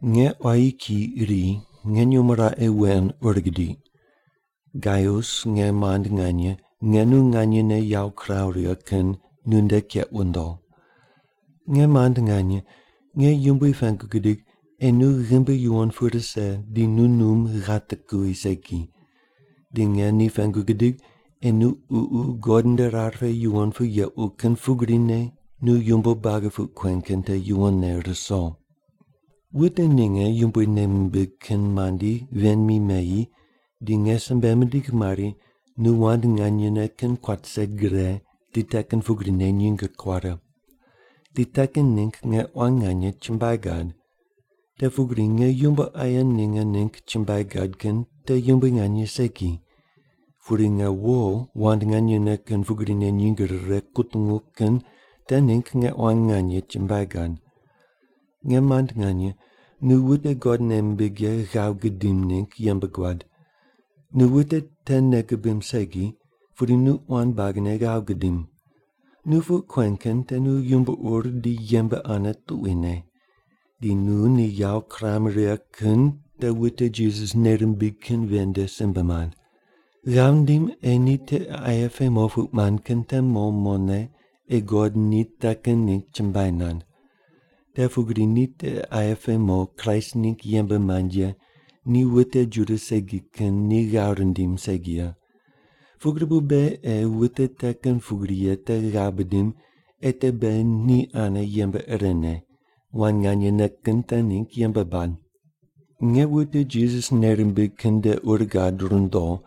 Nge quayi kiyi iri nge nyumo raqe wen ur gidiq. Gaius nge mand nganye, nge nu nganyene yawo kiraw righe kin, nunde keq wundo. Nge mand nganye, nge Yumbui pengu gidig ei nu ghimbi yuwon pu rise di nu num ghate kuwi segi. Di nge ni pengu gidig ei nu ququ God nde rar pe yuwon pu yequ kin pugrine nu yumbo buagi puq kuen kin te yuwonne ruso. Wute ninge Yumbui nei mimbig kin mandi ven mi meyi di nge simbe mindigh mari nu wand nganyene kin kuat rise gre di te kin pugrine nyinge kuare. Di te kin ningg nge quan nganye chumbuai gad. Te pugri nge yumbo aye ninge ningg chumbuai gad kin te yumbui nganye segi. Pudi nge wo wand nganyene kin pugrine nyinge rire kutungu kin te ningg nge quan nganye chumbuai gad. Nge mand nganye, nu wute God nei mimbig ye ghav gudim ningg yembe guad. Nu wute te nei gubim segi, pudi nu quan buagine ghav gudim. Nu puq kuen kin te nu yumbo ur di yembe ane tuquine. Di nu ni yawo kuram righe kin te wute Jisas nei rimbig kin ven nde simbe mand. Ghav ndim ei ni tiqe aye pe mo puq mand kin te mo mone ei God ni te kin ningg chumbuai nand. Te pugri ni tiqe aye pe mo Kraist ningg yembe mand ye ni wute Juda segi kin ni ghav rindim segi ye. Pugri bu beghi ei wute te kin pugri ye te ghav bidim ei te beghi ni ane yembe irene, wand nganyene kin te ningg yembe bad. Nge wute Jisas nei rimbig kin nde ur gad rundo,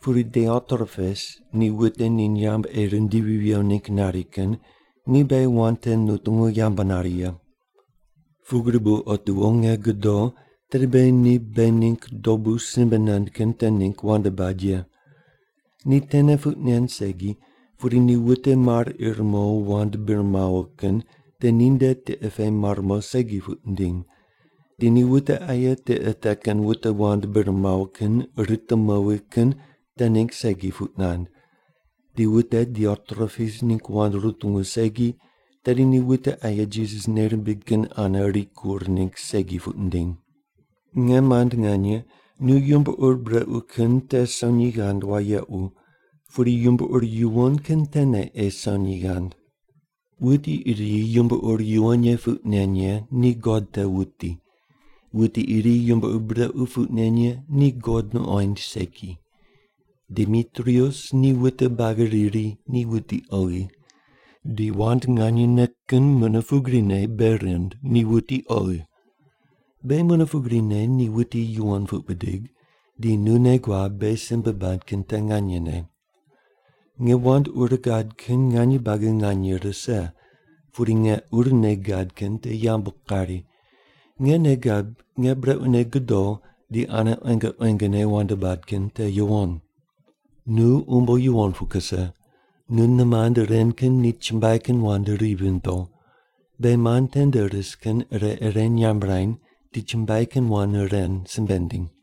pudi Diotrepes ni wute ni nyamb ei rindivi viwo ningg nari kin ni beghi wand te nutungu yambu nari ye. Pugri bu otiwo nge godo tedi beghi ni beghi ningg dobu simbe nand kin te ningg wand bad ye. Ni tene puq nen segi, pudi ni wute mar ir mo wand bir mawo kin te ninde tiqe pe mar mo segi puq nindim. Di ni wute aye tiqe te kin wute wand bir mawo kin rite mowi kin te ningg segi puq nand. Di wute Diotrepes ningg wand rutungu segi, tedi ni wute aye Jisas nei rimbig kin ane rikur ningg segi puq nindiny. Nge mand nganye, nu yumbo ur brequ kin te sonyi ghand wayequ, pudi yumbo ur yuwon kin tene ei sonyi ghand. Wuti iri yumbo ur yuwon ye puq nen ye ni God te wuti. Wuti iri yumbo ur brequ puq nen ye ni God nuqoind segi. Demitrius ni wute buagi riri ni wuti oghi. Di wand nganyene kin mune pugrine bei rind ni wuti oghi. Beghi mune pugrine ni wuti yuwon puq bidig, di nu nei guab beghi simbe bad kin te nganyene. Nge wand ur gad kin nganye buagi nganye rise, pudi nge urne gad kin te yambu kari. Nge nei gab nge brequne godo di ane quenge quengene wand bad kin te yuwon. Nu umbo yuwon pu kuse. Nu nimand ren kin ni chumbuai kin wand ri vindo. Beghi mand tende ris kin ire ire nyamb rany di chumbuai kin wand ren simbe ndiny.